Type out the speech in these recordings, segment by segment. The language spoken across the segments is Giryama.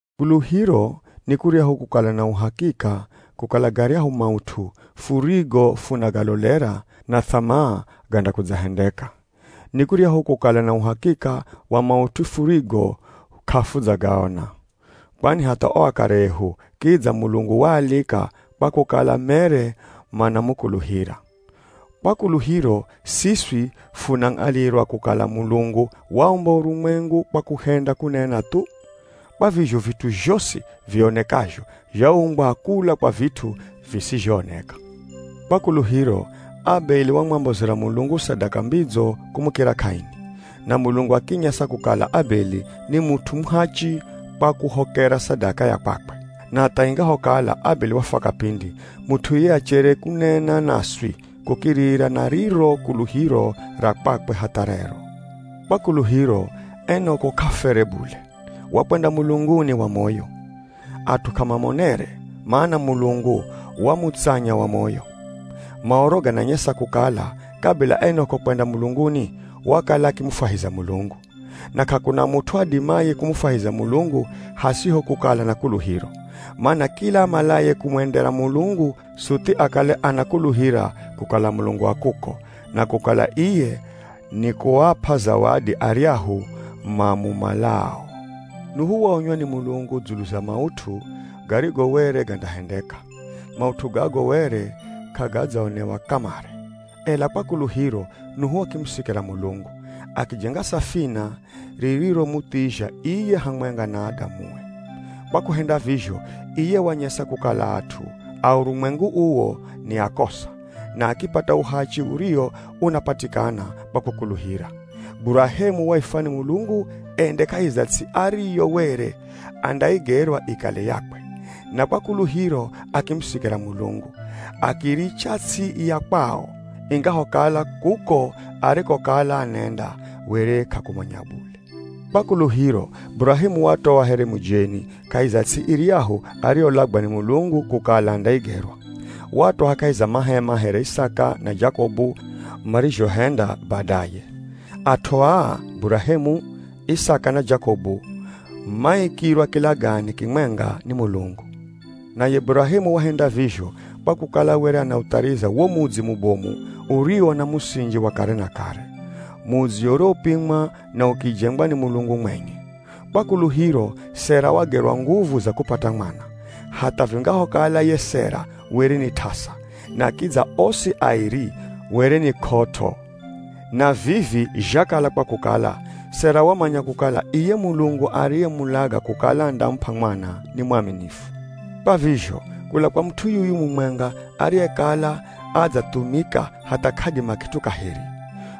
Kuluhiro ni kuryahu kukala na uhakika kukala garyahu maut'u furigo funagalolera na th'amaa gandakudzahendeka. Ni kuryahu kukala na uhakika wa maut'u furigo k'afudzagaona. Kwani hatha o akare ehu kidza Mulungu waalika kwa kukala mere manamukuluhira. Kwa kuluhiro, siswi funang'alirwa kukala Mulungu waumba urumwengu kwa kuhenda kunena thu. Kwa vizho vit'u zhosi vionekazho zhaumbwa kula kwa vit'u visizhooneka. Kwa kuluhiro, Abeli wamwambozera Mulungu sadaka mbidzo kumukira Kaini. Na Mulungu akinyesa kukala Abeli ni mut'u muhachi kwa kuhokera sadaka ya kwakwe. Na hatha ingahokala Abeli wafwa kapindi, mut'u iye achere kunena naswi kukirira na riro kuluhiro ra kwakwe hatha rero. Kwa kuluhiro, Enok'o k'afwere bule, wakwenda mulunguni wa moyo. At'u k'amamonere, mana Mulungu wamutsanya wa moyo. Maoro gananyesa kukala, kabila Enok'o kwenda mulunguni, wakala akimufwahiza Mulungu. Na k'akuna mut'u adimaye kumufwahiza Mulungu hasiho kukala na kuluhiro. Mana kila amalaye kumwendera Mulungu suthi akale anakuluhira kukala Mulungu a kuko, na kukala iye nikuap'a zawadi aryahu mamumalao. Nuhu waonywa ni Mulungu dzulu za maut'u garigo were gandahendeka. Maut'u gago were k'agadzaonewa kamare. Ela kwa kuluhiro, Nuhu akimusikira Mulungu. Akijenga safina ririromuthizha iye hamwenga na adamue. Kwa kuhenda vizho, iye wanyesa kukala at'u a urumwengu uwo ni akosa, na akipata uhachi uriwo unapatikana kwa kukuluhira. Burahemu waifwa ni Mulungu ende kahi za ts'i ariyo were andaigerwa ikale yakwe. Na kwa kuluhiro akimusikira Mulungu. Akiiricha ts'i ya kwao, ingahokala kuko arikokala anenda were k'akumanya bule. Kwa kuluhiro, Burahemu watoa here mujeni kahi za ts'i iryahu ariyolagwa ni Mulungu kukala andaigerwa. Watoa kahi za mahema here Isaka na Jakobu marizhohenda badaye. At'u aa Burahemu, Isaka na Jakobu, maikirwa kilagane kimwenga ni Mulungu. Naye Burahemu wahenda vizho kwa kukala were anauthariza wo mudzi mubomu uriwo na musinji wa kare na kare. Mudzi uriwopimwa na ukijengwa ni Mulungu mwenye. Kwa kuluhiro, Sera wagerwa nguvu za kupata mwana, hatha vingahokala ye Sera were ni t'asa, na kidza osi airi were ni k'ot'o. Na vivi zhakala kwa kukala, Sera wamanya kukala iye Mulungu ariyemulaga kukala andamup'a mwana ni mwaminifu. Kwa vizho, kula kwa mut'u yuyu mumwenga ariyekala adzathumika hatha k'adima kit'u kaheri,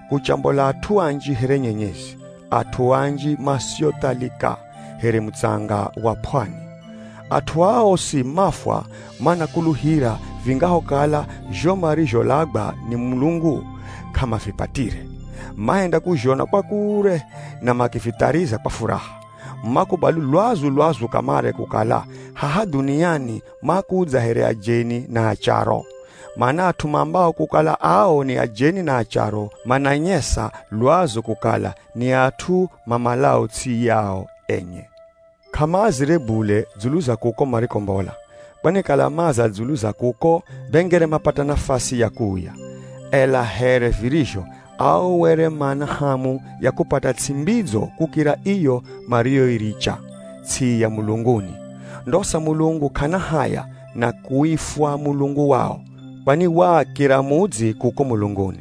kuchambola at'u anji here nyenyezi, at'u anji masiothalika, here mutsanga wa p'wani. At'u aa osi mafwa manakuluhira vingahokala zho marizholagwa ni Mulungu k'amavipatire. Mahenda kuzhona kwa kure na makivithariza kwa furaha. Makubali lwazu-lwazu kamare kukala haha dhuniani makudza here ajeni na acharo. Mana at'u maambao kukala ao ni ajeni na acharo, mananyesa lwazu kukala ni at'u mamalao ts'i yao enye. K'amaazire bule dzulu za kuko marikombola, kwani kala maaza dzulu za kuko be ngere mapata nafasi ya kuuya. Ela here virizho, ao were mana hamu ya kupata ts'i mbidzo kukira iyo mariyoiricha, ts'i ya mulunguni. Ndosa Mulungu k'ana haya na kuifwa Mulungu wao, kwani waaakira mudzi kuko mulunguni.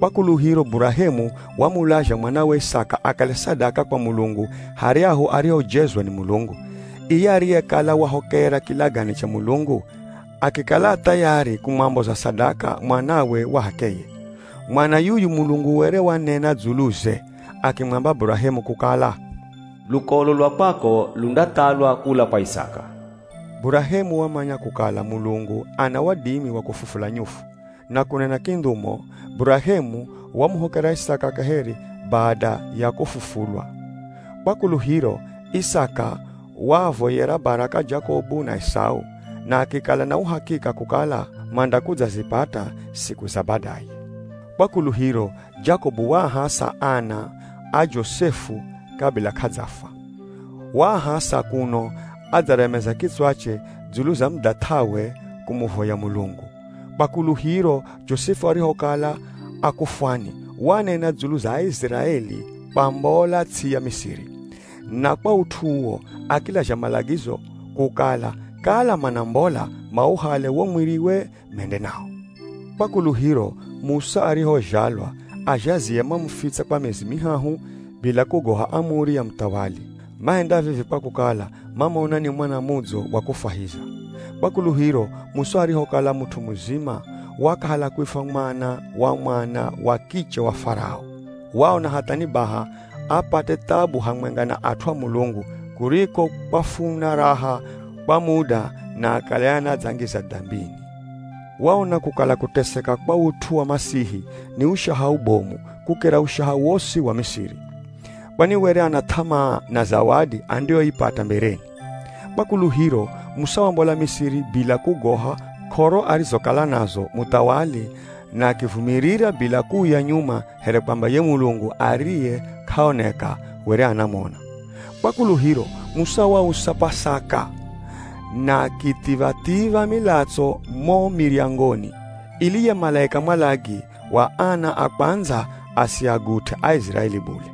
Kwa kuluhiro Burahemu wamulazha mwanawe Isaka akale sadaka kwa Mulungu haryahu arihojezwa ni Mulungu. Iye ariyekala wahokera kilagane cha Mulungu, akikala a thayari kumwamboza sadaka mwanawe wa h'akeye. Mwana yuyu Mulungu were wanena dzuluze akimwamba Burahemu kukala, “Lukolo lwa kwako lundathalwa kula kwa Isaka.” Burahemu wamanya kukala Mulungu ana wadimi wa kufufula nyufu. Na kunena kindhumo, Burahemu wamuhokera Isaka kaheri bada ya kufufulwa. Kwa kuluhiro, Isaka waavoyera baraka Jakobu na Esau, na akikala na uhakika kukala mandakudzazipata siku za badaye. Kwa kuluhiro, Jakobu waahasa ana a Josefu kabila k'adzafwa. Waahasa kuno adzaremeza kitswache dzulu za mudhath'awe kumuvoya Mulungu. Kwa kuluhiro, Josefu arihokala akufwani, wanena dzulu za Aiziraeli kwambola ts'i ya Misiri. Na kwa ut'u uwo, akilazha malagizo kukala kala manambola mauhale wo mwiriwe mende nawo. Kwa kuluhiro, Musa arihozhalwa, azhazie mamufitsa kwa miezi mihahu bila kugoha amuri ya muthawali. Mahenda vivi kwa kukala mamona ni mwana mudzo wa kufwahiza. Kwa kuluhiro, Musa arihokala mut'u muzima, wakahala kuifwa mwana wa mwana wa kiche wa Farao. Waona hatha ni baha apate thabu hamwenga na at'u a Mulungu, kuriko kwafuna raha kwa muda na akale anadzangiza dambini. Waona kukala kuteseka kwa ut'u wa Masihi ni ushaha ubomu kukira ushaha wosi wa Misiri. Kwani were ana th'amaa na zawadi andiyoipata mbereni. Kwa kuluhiro, Musa wambola Misiri bila kugoha k'oro arizokala nazo muthawali na akivumirira bila kuuya nyuma here kwamba ye Mulungu ariye k'aoneka were anamona. Kwa kuluhiro, Musa wausa P'asaka na akithiv̱a-thiv̱a milatso mo miryangoni ili ye malaika mwalagi wa ana a kwandza asiagut'e Aiziraeli bule.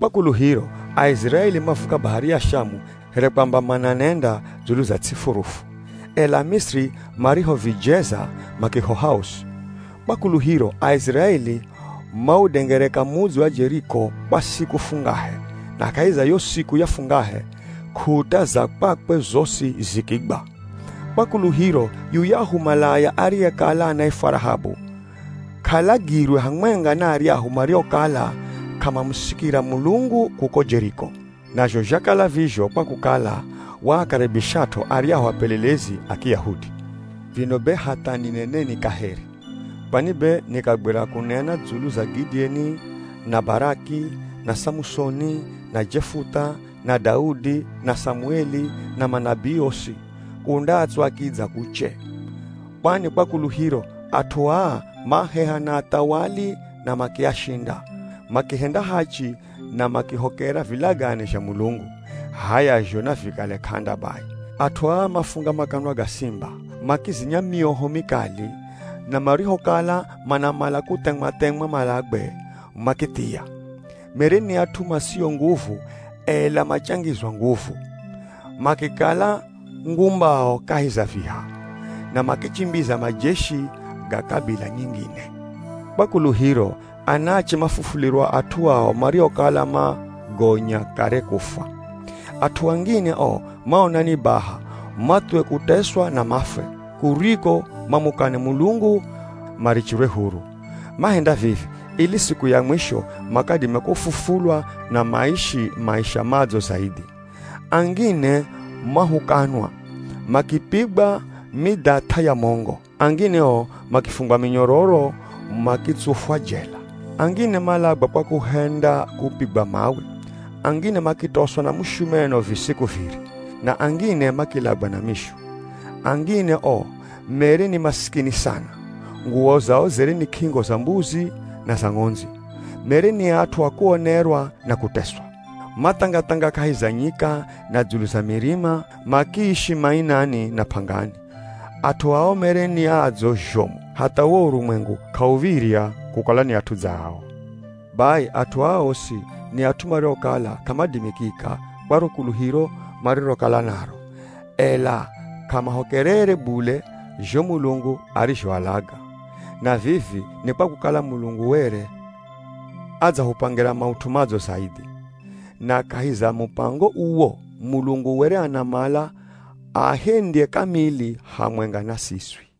Kwa kuluhiro, Aiziraeli mavuka Bahari ya Shamu here kwamba mananenda dzulu za ts'i furufu. Ela Amisiri marihovijeza makihoha osi. Kwa kuluhiro, Aiziraeli maudengereka mudzi wa Jeriko kwa siku fungahe, na kahi za yo siku ya fungahe, k'ut'a za kwakwe zosi zikigwa. Kwa kuluhiro, yuyahu malaya ariyekala anaifwa Rahabu, k'alagirwe hamwenga na aryahu mariokala k'amamusikira Mulungu kuko Jeriko. Nazho zhakala vizho kwa kukala waakaribishat'o aryahu apelelezi a Kiyahudi. Vino be hatha nineneni kaheri! Kwani be nikagwira kunena dzulu za Gidieni, na Baraki, na Samusoni, na Jefutha, na Daudi, na Samueli, na manabii osi, kundatswa kidza kuche. Kwani kwa kuluhiro, at'u aa maheha na athawali na makiashinda, makihenda hachi na makihokera vilagane zha Mulungu. H'aya zho navikale k'anda bai, at'u aa mafunga makanwa ga simba, makizinya myoho mikali, na marihokala manamala kuthemwa-themwa malagwe, makithia. Mere ni at'u masio nguvu, ela machangizwa nguvu. Makikala ngumbao kahi za viha, na makichimbiza majeshi ga kabila nyingine. Kwa kuluhiro, anaache mafufulirwa at'u ao mariokala magonya kare kufwa. At'u angine o maona ni baha mathuwe kuteswa na mafwe, kuriko mamukane Mulungu marichirwe huru. Mahenda vivi, ili siku ya mwisho makadime kufufulwa na maishi maisha madzo zaidhi. Angine mahukanwa, makipigwa midhath'a ya mongo. Angine o makifungwa minyororo makitsufwa jela. Angine malagwa kwa kuhenda kupigwa mawe, angine makitoswa na mushumeno visiku viri, na angine makilagwa na mishu. Angine o mere ni masikini sana. Nguwo zao zere ni k'ingo za mbuzi na za ng'ondzi. Mere ni at'u a kuonerwa na kuteswa. Mathanga-thanga kahi za nyika na dzulu za mirima, makiishi mainani na p'angani. At'u ao mere ni adzo zhomu hatha wo urumwengu k'auv̱irya kukalwa ni at'u dza ao. Bai, at'u aa osi, ni at'u mariokala k'amadimikika kwa ro kuluhiro marirokala naro, ela k'amahokerere bule zho Mulungu arizhoalaga. Na vivi ni kwa kukala Mulungu were adzahupangira maut'u madzo zaidhi. Na kahi za mupango uwo, Mulungu were anamala aahendye kamili hamwenga na siswi.